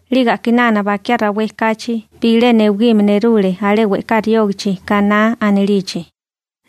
'Lige a'kinana bakiá rawé kachi bilé newigime nerule alé we'ká riógichi Kaná anilichi,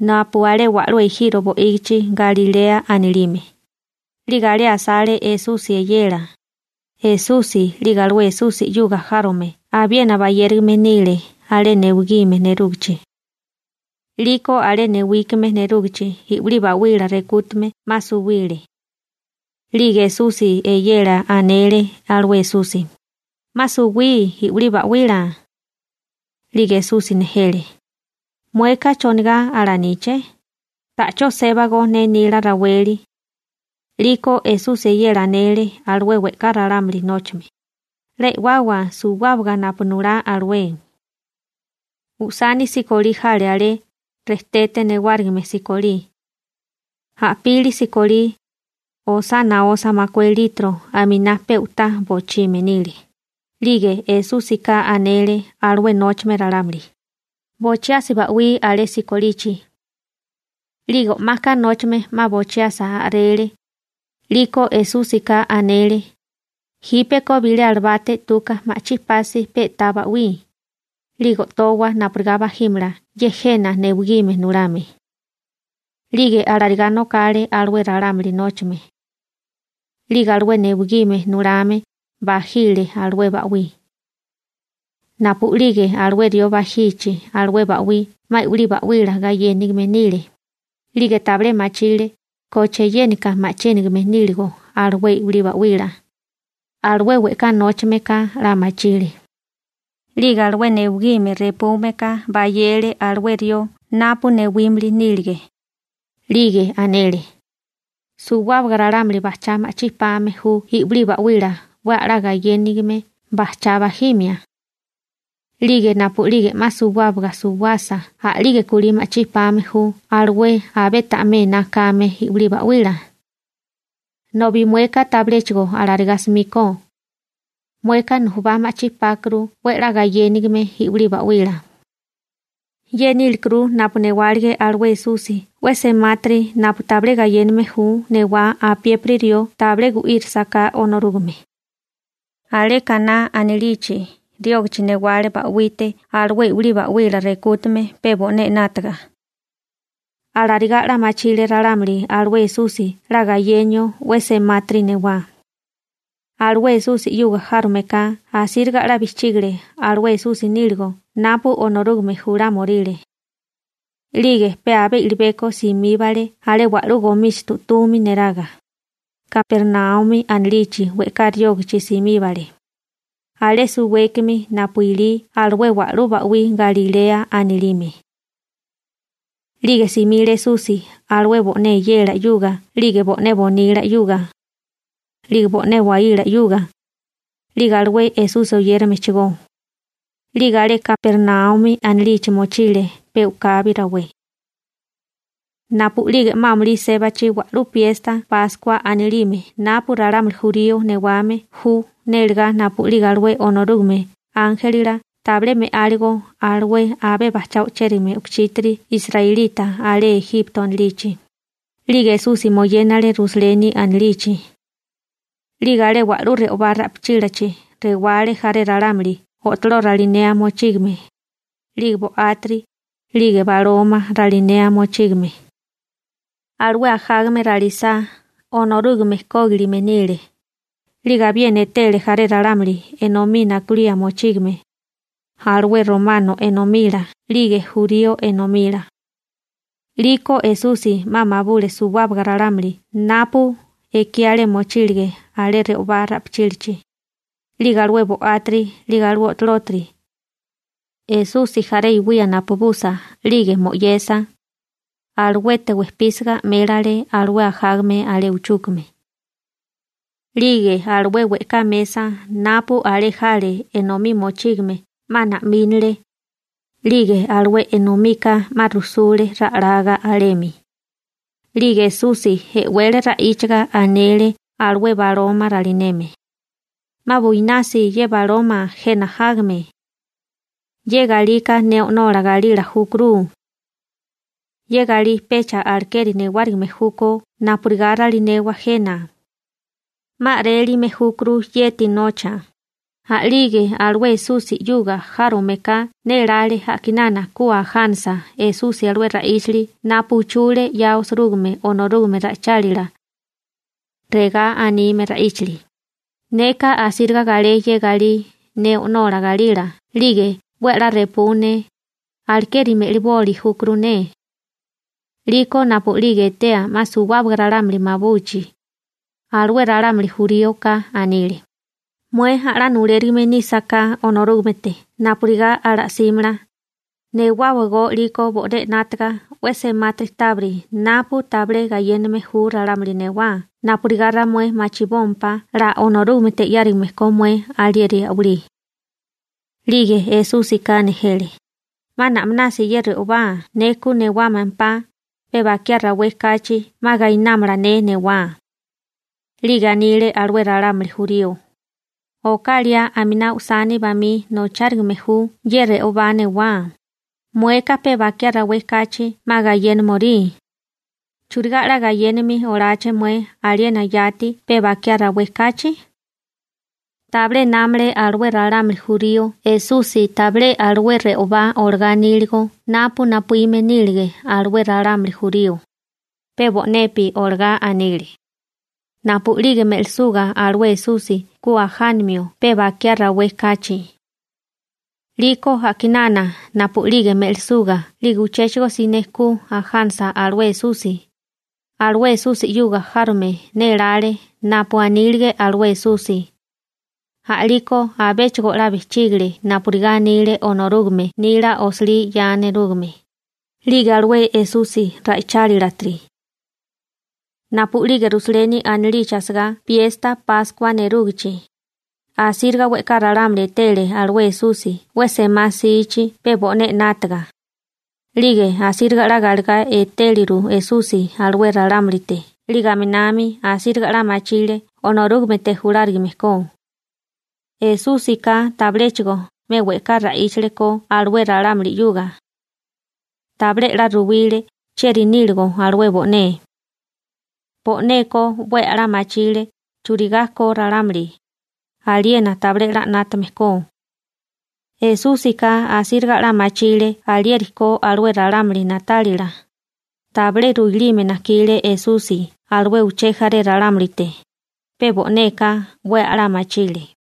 napu alé wa'lú ejiro bo'ígichi Galilea anilime, 'lige alé asale Esusi eyela. Esusi 'lige alué Esusi 'yuga járome abiena bayérigame nile alé newigime nerúgichi. 'Liko alé newigime nerúgichi i'wilí ba'wila rekútame 'ma suwile. 'Lige Esusi eyela anele alué Esusi: ―'Ma suwí i'wilí ba'wila. 'Lige Esusi nejele: ―¿Mueka, chonigá alaníché? Ta'chó sébago ne nila raweli. 'Liko, Esusi eyela anele alué we'ká ralámuli nóchame: ―'La e'wawa suwábaga napu nulá alué. Usani sikolí jale alé, rejtete newárigime sikolí. A'pili sikolí osá naosa makué litro aminá pe u'tá bochime nile. 'Lige Esúsika anele alué nóchame ralámuli: ―Bochiasi ba'wí alé sikolichi. 'Lige o'maka nóchame 'ma bochiasa a'rele, 'liko Esúsika anele: ―Jípeko bilé alabate 'tuka ma'chí pasi pe'tá ba'wí, 'lige o'towa napurigá bajímala ye jena newigime nulame. 'Lige alarigá nokale alué ralámuli nóchame. 'Lige alué newigime nulame bajile alué ba'wí. Napu'lige alué rió bajichi alué ba'wí 'ma i'wilí ba'wila gayénigime nile, 'lige tabilé machile koche yénika ma'chínigame níligo alué i'wilí ba'wila, alué we'ká nóchame ka 'la machile. 'Lige alué newigime repúmeka bayele alué rió napu newímili nílige, 'lige anele: ―Suwábaga ralámuli bajchá ma'chí pame ju i'wilí ba'wila 'we a'lá gayénigime bajchá bajimia. 'Lige napu'lige 'ma suwábaga suwasa a'lige kulí ma'chí pame ju alué abé ta'mé ená kame i'wilí ba'wila. Nobi mueka tabiléchigo alarigá 'smíkó. Mueka nujubá ma'chí pákuru 'we 'la gayénigame i'wilí ba'wila. Ye nílekuru napu newálige alué Esusi 'we semátiri napu tabilé gayéname ju newá apiépiri rió tabilé gu'írasaká Onorúgame. Alé Kaná anilichi riógichi newale ba'wite alué i'wilí ba'wila rekútame pe bo'né 'nátaga. Alarigá 'la machile ralámuli alué Esusi 'la gayenio 'we semátiri newá. Alué Esusi 'yuga járome ka asíriga 'la bijchígale alué Esusi níligo napu Onorúgame julámioríle. 'Lige pe abé i'libeko simíbale alé wa'lú gomíchitu 'tumi neraga, Kapernaumi anilichi we'ká riógichi simíbale, alé suwékimi napu ilí alué wa'lú ba'wí Galilea anilime. 'Lige simile Esusi alué bo'né eyela 'yuga 'lige bo'né nasípasi bonila 'yuga, 'lige bo'né nasípasi waíla 'yuga, 'lige alué Esusi oyéramechigó, 'lige alé Kapernaumi anilichi mochile pe u'kabi rawé. Napu'lige 'ma amulí sébachi wa'lú piesta Páskua anilime napu ralámuli jurío newame ju nélegá napu'lige alué Onorúgame ánjelila tabilé me'áligo alué abé bajchá o'chérigame u'kuchítiri israelita alé Ejipto anilichi, 'lige Esusi moyénale Rusaleni anilichi. 'Lige alé wa'lú re'obá ra'pichílachi rewale jaré ralámuli o'toló ralinea mochígame, 'lige bo'átiri, 'lige baloma ralinea mochígame. Alué ajágame ralisá, Onorúgame kógilime nile. 'Lige abiena etele jaré ralámuli enomí nakulía mochígame, alué romano enomila 'lige jurío enomila. 'Liko Esusi 'ma mabule suwábaga ralámuli napu ekí alé mochílige alé re'obá ra'pichílachi, 'lige alué bo'átiri, 'lige alué o'tolótiri. Esusi jaré iwía napubusa 'lige mo'yesa, aluete wejpísiga 'mélele alué ajágame alé uchúkame. 'Lige alué we'ká mesa napu alé jale enomí mochígame 'ma na'mínale, 'lige alué enomika 'ma rujsule ra'laga alemi. 'Lige Esusi e'wele ra'íchaga anele alué baloma ralineme: ―'Ma buinasi ye baloma jena jágame. Ye galika ne o'nola galila júkuru. Ye galí pecha alekeri newárigime júkó napurigá ralinewa jena. ¡'Ma a'rélime júkuru yeti nocha! A'lige alué Esusi 'yuga járomeka nélále a'kinana ku ajánasa Esusi alué ra'íchili napu uchule 'ya osirúgime Onorúgame ra'ichálila. Regá anime ra'íchili: ―Neka asíriga galé ye galí ne o'nola galila 'lige 'we a'lá repú ne, alekeri me'liboli júkuru ne. 'Liko napu'lige etea 'ma suwábaga ralámuli mabuchi, alué ralámuli juríoka anile: ―Mué a'lá nulérigime nísaká Onorúgamete napurigá ala'símala, newáwagó 'liko bo'né 'nátaga 'we semátiri tábiri napu tabilé gayéname ju ralámuli newá napurigá ramué machibómpá 'la Onorúgamete 'yárigame ko mué alieri a'walí. 'Lige Esúsika nejele: ―'Ma na'minasi ye re'obá ne ku newámampá, pe bakiá rawé kachi 'ma gainámala ne newá. 'Lige anile alué ralámuli jurío: ―Oká liá aminá usani bamí nochárigame ju ye re'obá newá, mueka pe bakiá rawé kachi 'ma gayénimorí. ¿Churigá 'la gayénimi oláché mué aliena yati pe bakiá rawé kachi? Tabilé námale alué ralámuli jurío Esusi tabilé alué re'obá olagá aníligo napu napuíme nílige alué ralámuli jurío, pe bo'nepi olagá anile, napu'lige me'lisuga alué Esusi ku ajánamio pe bakiá rawé kachi. 'Liko a'kinana napu'lige me'lisuga 'lige uchéchigo siné ku ajánasa alué Esusi, alué Esusi 'yuga járome nélále napu anílige alué Esusi, a'liko abéchigo 'la bijchígile napurigá anile Onorúgame nila osilí 'ya nerúgame, 'lige alué Esusi ra'ichálilatiri. Napu'lige Rusaleni anilichi asagá piesta Páskua nerúgichi, asíriga we'ká ralámuli etele alué Esusi 'we semá 'sichi pe bo'né 'nátaga, 'lige asíriga 'la galegá etéleru Esusi alué ralámulite 'lige aminami asíriga 'la machile Onorúgamete julárigame ko. Esúsika tabiléchigo 'me we'ká ra'íchale ko alué ralámuli 'yuga. Tabilé 'la ruwile chieri níligo alué bo'né. Bo'neka 'we a'lá machile churigá ko ralámuli, aliena tabilé 'la 'nátame ko. Esúsika asíriga 'la machile alieri ko alué ralámuli na'tálila, tabilé ruilime najkile Esusi alué uché jaré ralámulite, pe bo'neka 'we a'lá machile.